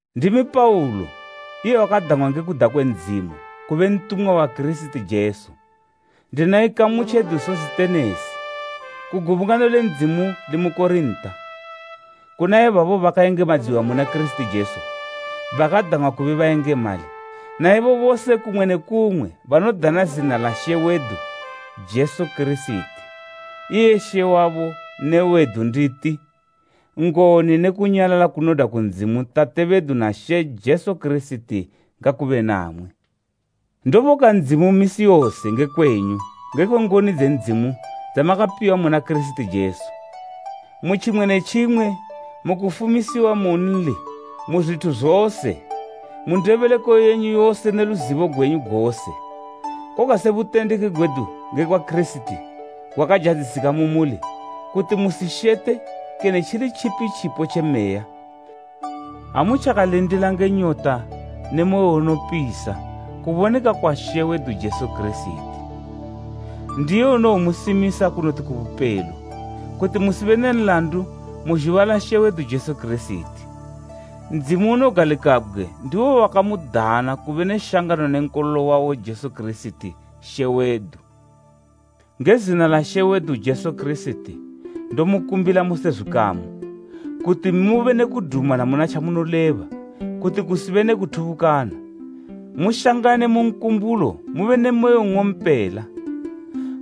Ndimi Paulo, iye wakadang'wa nge kuda kwe Ndzimu kube ntumwa wa Kirisiti Jesu, ndina ikamu tjedu Sositenesi. Ku gubungano le Ndzimu limu Korinta, kuna ibabo bakayengemadziwa muna Kirisiti Jesu, bakadang'wa kube bayengemali, naibo bose kumwe ne kumwe banodana zina la She wedu Jesu Kirisiti, iye She wabo ne wedu nditi: Ngoni ne kunyalala kunodwa ku Ndzimu Tate bedu na She Jesu Kirisiti ngakube namwi. Ndoboka Ndzimu misi yose nge kwenyu ngekwe ngoni dze Ndzimu dzamakapiwa muna Kirisiti Jesu, mu tjimwe ne tjimwe mu kufumisiwa mu nli mu zwithu zose, mu ndebeleko yenyu yose ne luzibo gwenyu gose. Koga se butendeki gwedu ngekwa Kirisiti gwakazhadzisika mu muli, kuti musishete kene tjili tjipi tjipo tje meya, ha mutjakalindila nge nyota ne moyo unopisa kuboneka kwa She wedu Jesu Kirisiti. Ndiye unowomusimisa kunoti ku bupelo, kuti musibe ne nlandu mu zhuba la She wedu Jesu Kirisiti. Ndzimu unogalikabgwe ndiwo wakamudana kube ne shangano ne Nkololo wawo Jesu Kirisiti, She wedu. Nge zina la She wedu Jesu Kirisiti ndomukumbila mose zwikamu, kuti mube ne kudumana muna tjamunoleba kuti kusibe ne kuthubukana, mushangane mu nkumbulo mube ne moyo nng'ompela.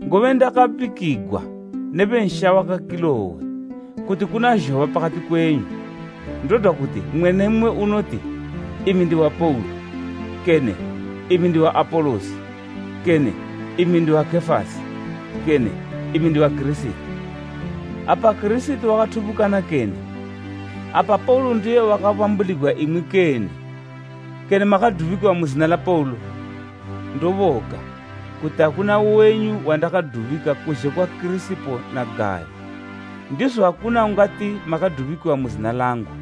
Ngobe ndakabikigwa ne bensha waka Kilowe kuti kuna zhoba pakati kwenyu. Ndodwa kuti, mmwe ne mmwe unoti “Imi ndiwa Paulo,” kene “Imi ndiwa Apolosi,” kene “Imi ndiwa Kefasi,” kene “Imi ndiwa Kirisiti.” Apa Kirisiti wakathubukana kene? Apa Paulo ndiye wakabambuligwa imwi kene? Kene makadubikiwa mu zina la Paulo? Ndoboka kuti akuna wenyu wandakadubika kuzhe kwa Kirisipo na Gayo. Ndizo akuna ungati makadubikiwa mu zina langu,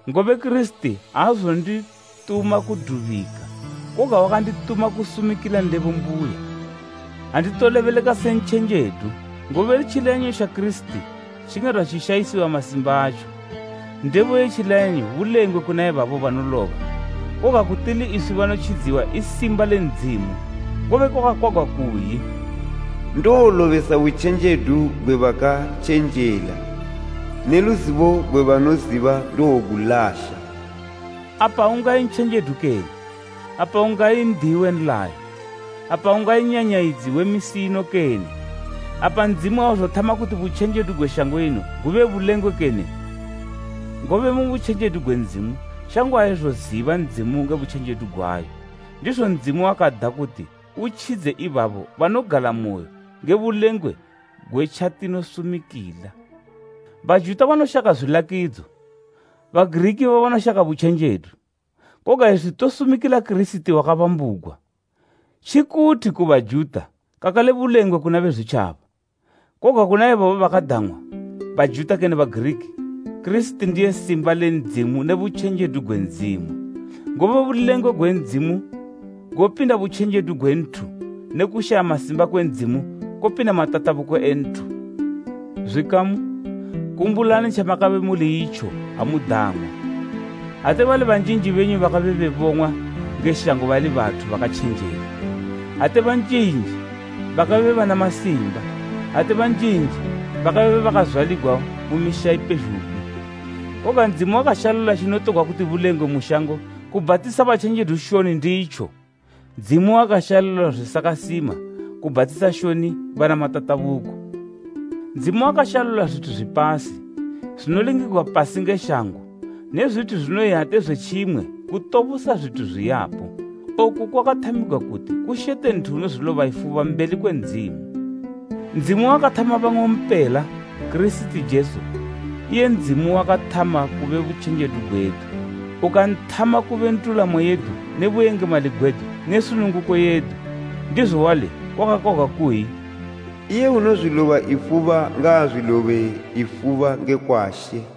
Ngobe Kirisiti aazondituma kudubika, koga wakandituma kusumikila ndebo mbuya. Anditolebeleka se ntjenjedu, ngobe tjileyanyo tja Kirisiti tjingadwa tjishayisiwa masimba atjo. Ndebo ye tjileyanyo bulengwe kuna ibabo banoloba, koga ku tili iswi banotjidziwa i simba le Ndzimu. Ngobe kwakakwagwa kukayi, “Ndowolobesa butjenjedu gwe bakatjenjela, ne luzibo gwe banoziba ndowogulasha.” Apa ungayi ntjenjedu kene? Apa ungayi n'diyi we nlayo? Apa ungayi nyanyayidzi we misi ino kene? Apa Ndzimu auzothama kuti butjenjedu gwe shango ino gube bulengwe kene? Ngobe mu butjenjedu gwe Ndzimu, shango aizoziba Ndzimu nge butjenjedu gwayo, ndizo Ndzimu wakada kuti utjidze ibabo banogalamoyo nge bulengwe gwe tjatinosumikila. Bajuta banoshaka zwilakidzo, Bagiriki ibo banoshaka butjenjedu. Koga iswi tosumikila Kirisiti wakabambugwa, tjikuthi ku Bajuta kakale bulengwe kuna Bezwitjaba, Koga kuna ibabo bakadang'wa, Bajuta kene Bagiriki, Kirisiti ndiye simba le Ndzimu ne butjenjedu gwe Ndzimu. Ngobe bulengwe gwe Ndzimu gopinda butjenjedu gwe nthu ne kushaya masimba kwe Ndzimu kopinda matatabuko e nthu. Zwikamu, kumbulani tjamakabe muli itjo ha mudang'wa, ate bali banjinji benyu bakabe bebong'wa nge shango bali bathu bakatjenjela, ate banjinji bakabe bana masimba, ate banjinji bakabe bazwaligwa mu misha ipezhugwi. Koga Ndzimu wakashalula tjinotogwa kuti bulengwe mu shango kubhatisa batjenjedu shoni nditjo, Ndzimu wakashalula zwisakasima kubhatisa shoni bana matatabuko. Ndzimu wakashalula zwithu zwipasi, zwinolingigwa pasi nge shango ne zwithu zwinoyi ate zwe tjimwe kutobosa zwithu zwiyapo. Oku kwakathamigwa kuti kushete nthu unozwiloba ifuba mbeli kwe Ndzimu. Ndzimu wakamuthama bang'ompela na Kirisiti Jesu, iye Ndzimu wawakathama kube butjenjedu gwedu, ukanthama kube ndulamo yedu ne buyengemali gwedu ne sununguko yedu. Ndizo wali kwakakwagwa kuyi, “Iye unozwiloba ifuba ngaazwilobe ifuba ngekwa She.”